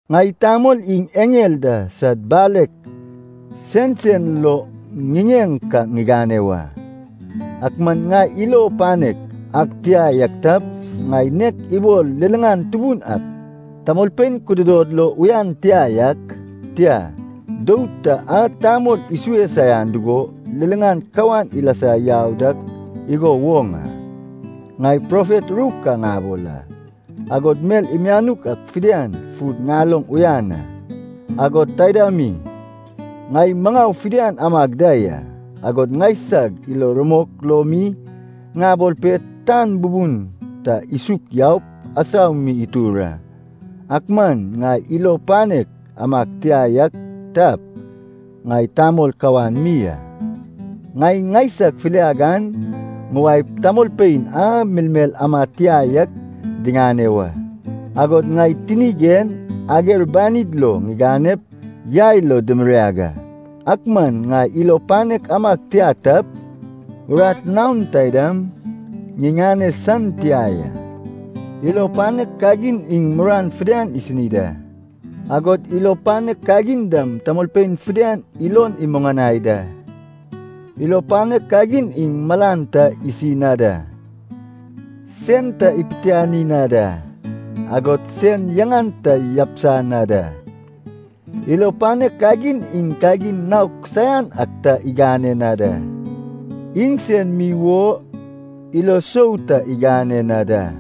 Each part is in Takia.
Ŋai tamol iŋ eŋel da sad balek sensen lo ŋiŋeŋ ka ŋigane wa, ak man ŋai ilo panek ag tia yak tap, ŋai nek ibol liliŋan tubun ak tamolpein kududod lo uyan tia yak, tia, dou ta a tamol isue saian dugo liliŋan kawan ilasa yau dak igo woŋ a. Ŋai profet ru ka ŋabol a, agod mel mianuk ak fidian fud ŋaloŋ uyan a, agod taida mi ŋai maŋau fidian amag da ya, agod ŋaisag ilo rumok lo mi ŋabol pe tan bubun ta isuk yaup asau mi itur a, ak man ŋai ilo panek amag tia yak tap, ŋai tamol kawan mi a. Ŋai ŋaisag filiag an ŋuwaep tamolpein a melmel amad tia yak diŋane wa, agod ŋai tinig en ager banid lo ŋiganep yai lo dimiriag a, ak man ŋai ilo panek amag tia tap, urat naon taidam ŋiŋane san tia ya. Ilo panek kagin iŋ muruan fidian isini da, agod ilo panek kagin dam tamolpein fidian ilon imuŋanai da. Ilo panek kagin iŋ malan ta isi na da, sen ta ipitiani na da, agod sen yaŋan ta yabisa na da. Ilo panek kagin iŋ kagin naok saian ak ta igane na da, iŋsen mi wo ilo sou ta igane na da,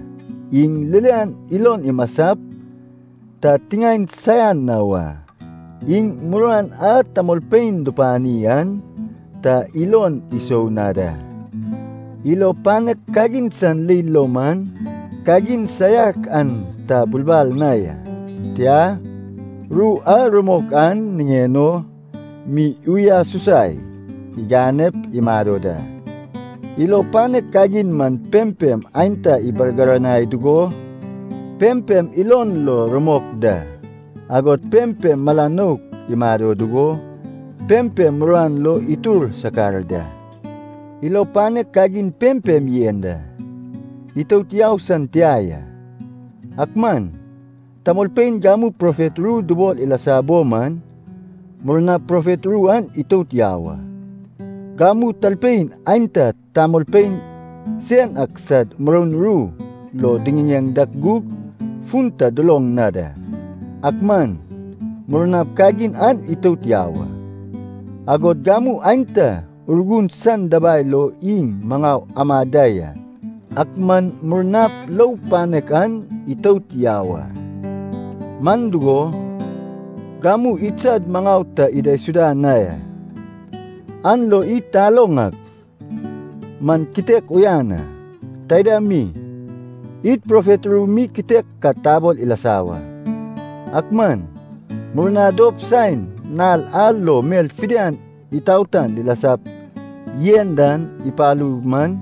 iŋ ririan ilon imasap ta tiŋaen saian na wa, iŋ muruan a tamolpein dupani an ta ilon isou na da. Ilo panek kagin san leil lo man, kagin saiak an ta bulbal na ya, tia, ru a rumok an niŋen o mi uyasusai iganep imado da. Ilo panek kagin man pempem aenta ibargiranai dugo, pempem ilon lo rumok da, agod pempem mala nouk imado dugo, pempem muruan lo itur sakar da. Ilo panek kagin pempem yen da, itout yau san tia ya. Ak man tamolpein gamu profet ru dubol ilasa bo man, murnap profet ru an itout yau a. Gamu talpein aenta tamolpein sen ak sad muroun ru lo diŋiŋeŋ dak gug fun ta duloŋ na da, ak man murnap kagin an itout yau a. Agod gamu aenta Urgun san dabai lo iŋ maŋau amad da ya, ak man murnap lou panek an itout yau a. Man dugo, gamu idsad maŋau ta idaisuda na ya, an lo id taloŋ ak man kitek uyan a. Taida mi, id profet ru mi kitek ka tabol ilasa wa. Ak man murna dop saen nal a lo mel fidian itaotan dilasap yen dan ipalu man,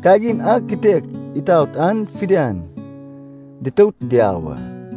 kagin a kitek itaot an fidian ditout diau a.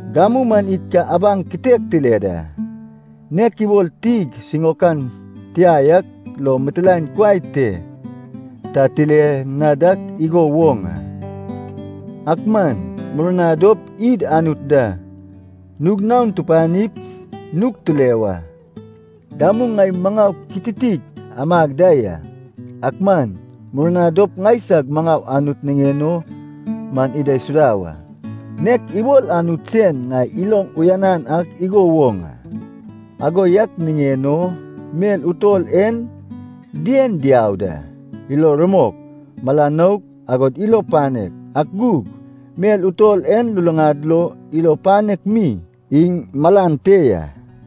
Gamu man id ka abaŋ kitek tile da, nek ibol tig siŋaokan tia yak lo mitilaen kuai te ta tile na dak igo woŋ a. Ak man murna dop id Anut da nug naon tupanip nug tile wa. Gamu ŋai maŋau kititik amag da ya, ak man murna dop ŋaisag maŋau Anut niŋen o man idaisuda wa, nek ibol Anut sen ŋai iloŋ uyanan ak igo woŋ a. Ago yak niŋen o mel utol en dien diau da, ilo rumok, mala nouk, agod ilo panek. Ak gug mel utol en luluŋad lo ilo panek mi iŋ malan te ya.